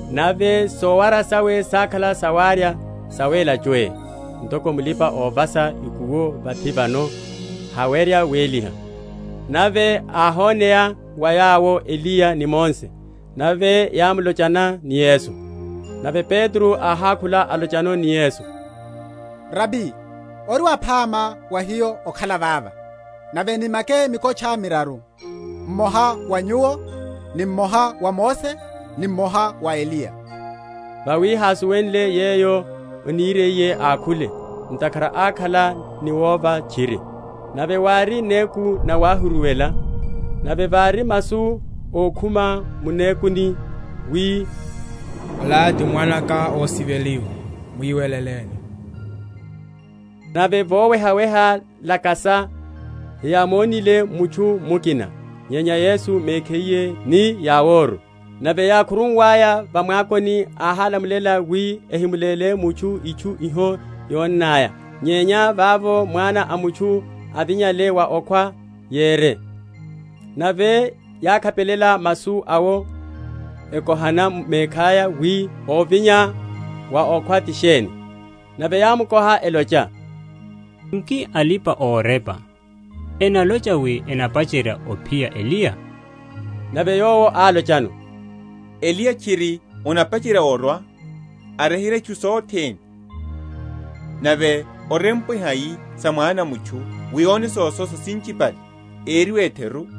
nave sowara sawe sákhala sawarya, sawéla chwé; ntoko mulipa‐ovasa ikuwo vathi vano hawerya wéliha. Nave yáhoneya wa yawo Eliya ni Mose; nave yámulochelana ni Yesu. Nave Petro áhákhula, alocha ni Yesu, Rabi, ori waphama wa hiyo okhala vava, nave nimake mikotcha miraru, mmoha wa Nyuwo, ni mmoha wa Mose, ni mmoha wa Eliya. Vawi hásuwenle yeyo aniriye ákhule; ntakhara ákhala ni wova tchiri. Nave wári néku nawáhuruwela; nave vári masu ókhuma mu nékuni’mmo, wi, Ola ti Mwana’ka ósiveliwa; mwiweleleni. Nave vowehaweha, lakasa, heyámonile mutchu mukina, nyenya Yesu mekhiye ni yaworu. Nave yákhuruwaya va mwakoni, áhálamulela wi ehimuléle mutchu itchu iho yonnaya nyenya vavo Mwana a mutchu avinyale wa okhwa, yere. Nave yákhapelela masu awo, ekohana mekhaya wi ovinya wa okhwa ti sheni. Nave yámukoha, elocha, Nki alipa‐orepa enalocha wi anapacherya ophiya Eliya? Nave Yowo álochano, Eliya tchiri anapacherya orwa, aryeherya itchu sothene; nave orempwe hai sa Mwana a mutchu wi óne sososa sinchipale eriwe etheru?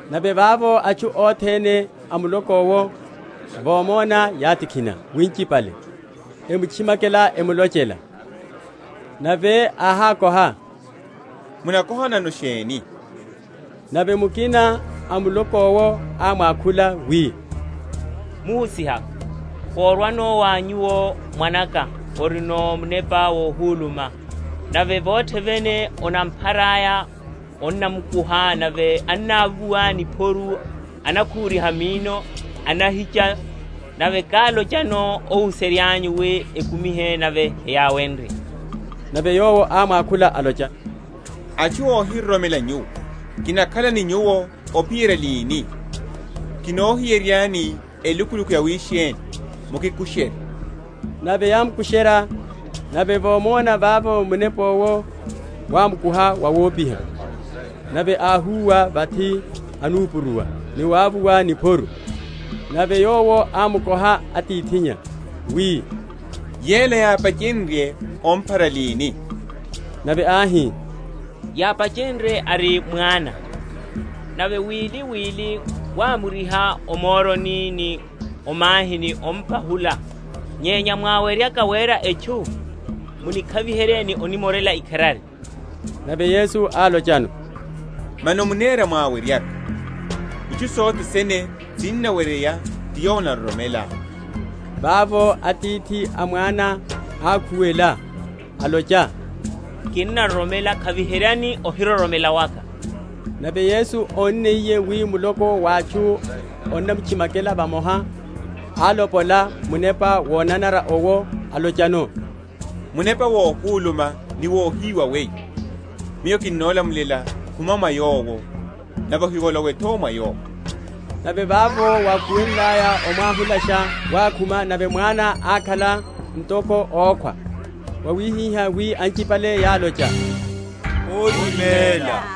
Nave vavo atchu othene a muloko’wo vomona, yátikhina winchipale, emutchimakela, emulochela. Nave áhákoha, Munakohanano sheni? Nave mukina a m’muloko’wo ámwakhula wi, Muhusiha, korwano wa Nyuwo mwana’ka, orino munepa wohuluma; nave vothe vene onampharaya, onnamukuha; nave annavuwa niphoru, anakhuriha minno, anahicha; nave kálochano óhuserya’nyu wi ekumihe; nave heyáwenrye. Nave Yowo ámwakhula, alocha, Atchu óhiroromela nyuwo, kinakhala ni nyuwo ophiyerya lini? kinohiyere?-?ryani elukuluku yawisheni? Mukikusherye. Nave yámukusherya; nave vomona, vavo munepa owo wámukuha wawopiha; nave áhúwa vathi, anupuruwa, ni wavuwa niphoru. Nave Yowo ámukoha atithinnya wi, Yela yápachenrye omphara lini? Nave áhi, Yápachenrye ari mwana. Nave wiliwili wámuriha o moroni ni o mahini, ompahula; nyenya mwáweryaka wera etchu, munikhaviherye, ni onimorela ikharari. Nave Yesu álochano, Mano munera mwáweryaka! itchu sothene sinnaweryeya ti yowo onaroromela. Vavo atithi a mwana ákhuwela, alocha, Kinnaroromela; khaviheryani ohiroromela waka. Nave Yesu ónniye wi muloko wa atchu onamutchimakela vamoha, álopola munepa wonanara owo, alochano, Munepa wohuluma ni wohiwa weyo, Miyo kinolamulela, khuma mwa yowo, nave ohivolowe’tho mwa yowo. Nave vavo wákhu?-?wenlaya, omwahulasha, wákhuma; nave mwana ákhala ntoko ókhwa; wawihihá wi anchipale yálocha, Óriméla.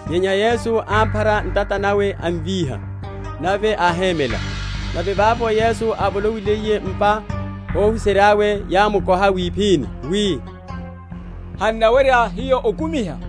Nyenya Yesu ámphara ntata nawe, amvíha; nave áhémela. Nave vavo Yesu ávolowiliye m’pa, óhuserya’we yámukoha wiphini wi, Han’nawerya hiyo okumiha?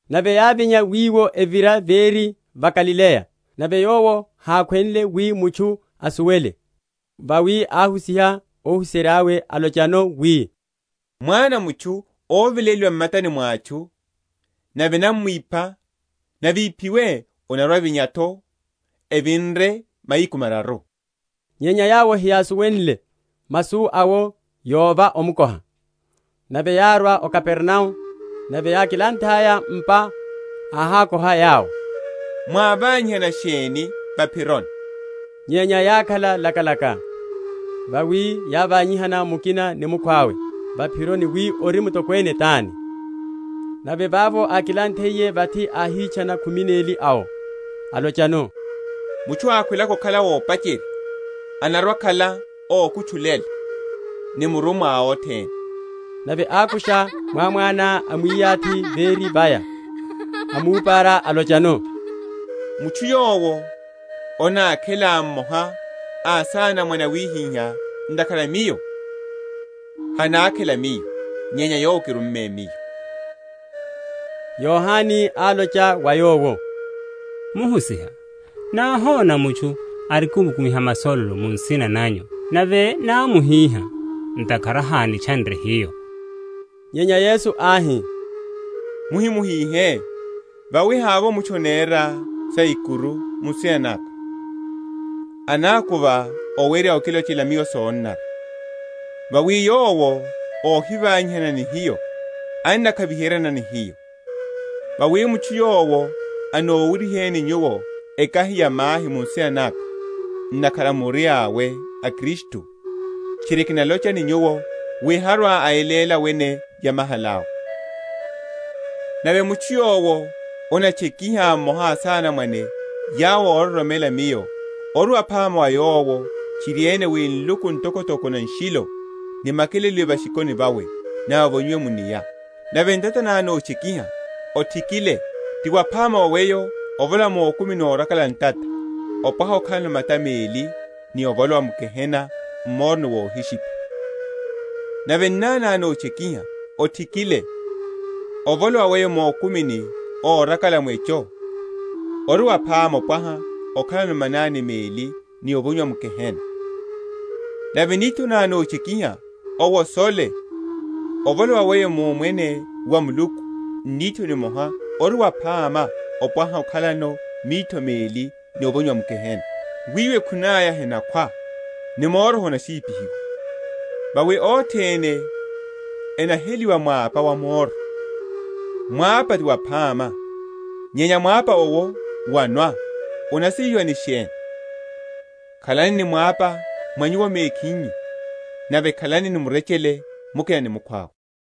Nave yávinya wiwo, evira véri va Galileya; nave Yowo hákhwenle wi mutchu asuwele. Vawi áhusiha óhuserya’we, alochano wi, Mwana a mutchu óveléliwa m’matani mwa atchu, nave enamwipha; nave íphiwe, anarwa‐avinya’tho evinre mahiku mararu. Nyenya yawo heyásuwenle masu awo, yova omukoha. Nave yárwa o Kapernao; nave yákilanthaya m’pa áhákoha yawo, Mwávanyihana sheni va’phironi? Nyenya yákhala lakalaka: vawi yávanyihana mukina ni mukhwawe va’phironi wi, ori mutokwene tani? Nave vavo ákilanthiye vathi, áhitchana khumi neli awo, alochano, Mutchu ákhwelaka okhala ópacherya, anarwa‐akhala ókutchulela ni murummwa a othene. Nave ákusha mwámwana amwiyathi véri vaya, amúpara, alochano, Mutchu yowo anákhela mmoha a asanamwane awihiha ntakhara a Miyo, hanákhela Miyo, nyenya Yowo ákirumale Miyo. Amwichani ni ahima. Yohane álocha wa Yowo, Muhusiha, náhona mutchu arikimkumiha masololo mu nsina nanyu nave námuhiha ntakhara hánitchanre hiyo. Nyenya Yesu áhi, Muhimuhihe; vawi havovo mutchu anera yaikuru mu nsina naka, anákuva owerya okilochela Miyo sonanara. Vawi yowo óhivanyihana ni hiyo, annakhaviheryana ni hiyo. Vawi mutchu yowo anowuryiheni nyuwo ekahi ya mahi mu nsina naka, ntakhara muri awe a Kristu, tchiri kinalocha ni nyuwo, wi harwa‐ayeléla wene yamahala’we. Sotchekiha. Nave mutchu yowo anatchekiha mmoha a asanamwane yawo óroromela Miyo, ori waphama wa yowo tchiriene wi nluku ntokotoko na nshilo nimakeleliwe va’shikoni vawe, nave avonyiwe mu’nia. Nave ntata ná notchekiha, othikile; ti waphama wa weyo ovolowa mukumini órakala ntata opwaha okhalano mata meli ni ovolowa m’gehena m’moroni wohishipha. Nave nnani ná notchekiha, othikile; ovolowa weyo mukumini órakala mwecho ori waphama opwaha okhalano mananiá meli ni ovonyiwa m’gehena. Nave nitho ná notchekiha, owosole; ovolowa weyo mu Omwene wa Muluku n’nitho nimoha ori waphama wopwaha okhalano mitho meli ni ovonyiwa m’gehena; wiwo ekhune aya henakhwa ni moro honashipihiwa. Vawi othene enaheliwa mwapa wa moro. Mwapa ti waphama; nyenya mwapa owo wónwa, munasiviha ni sheni? Khalani ni mwapa mwa nyuwo mekhinyu nave khalani ni murechele mukina ni mukhwawe.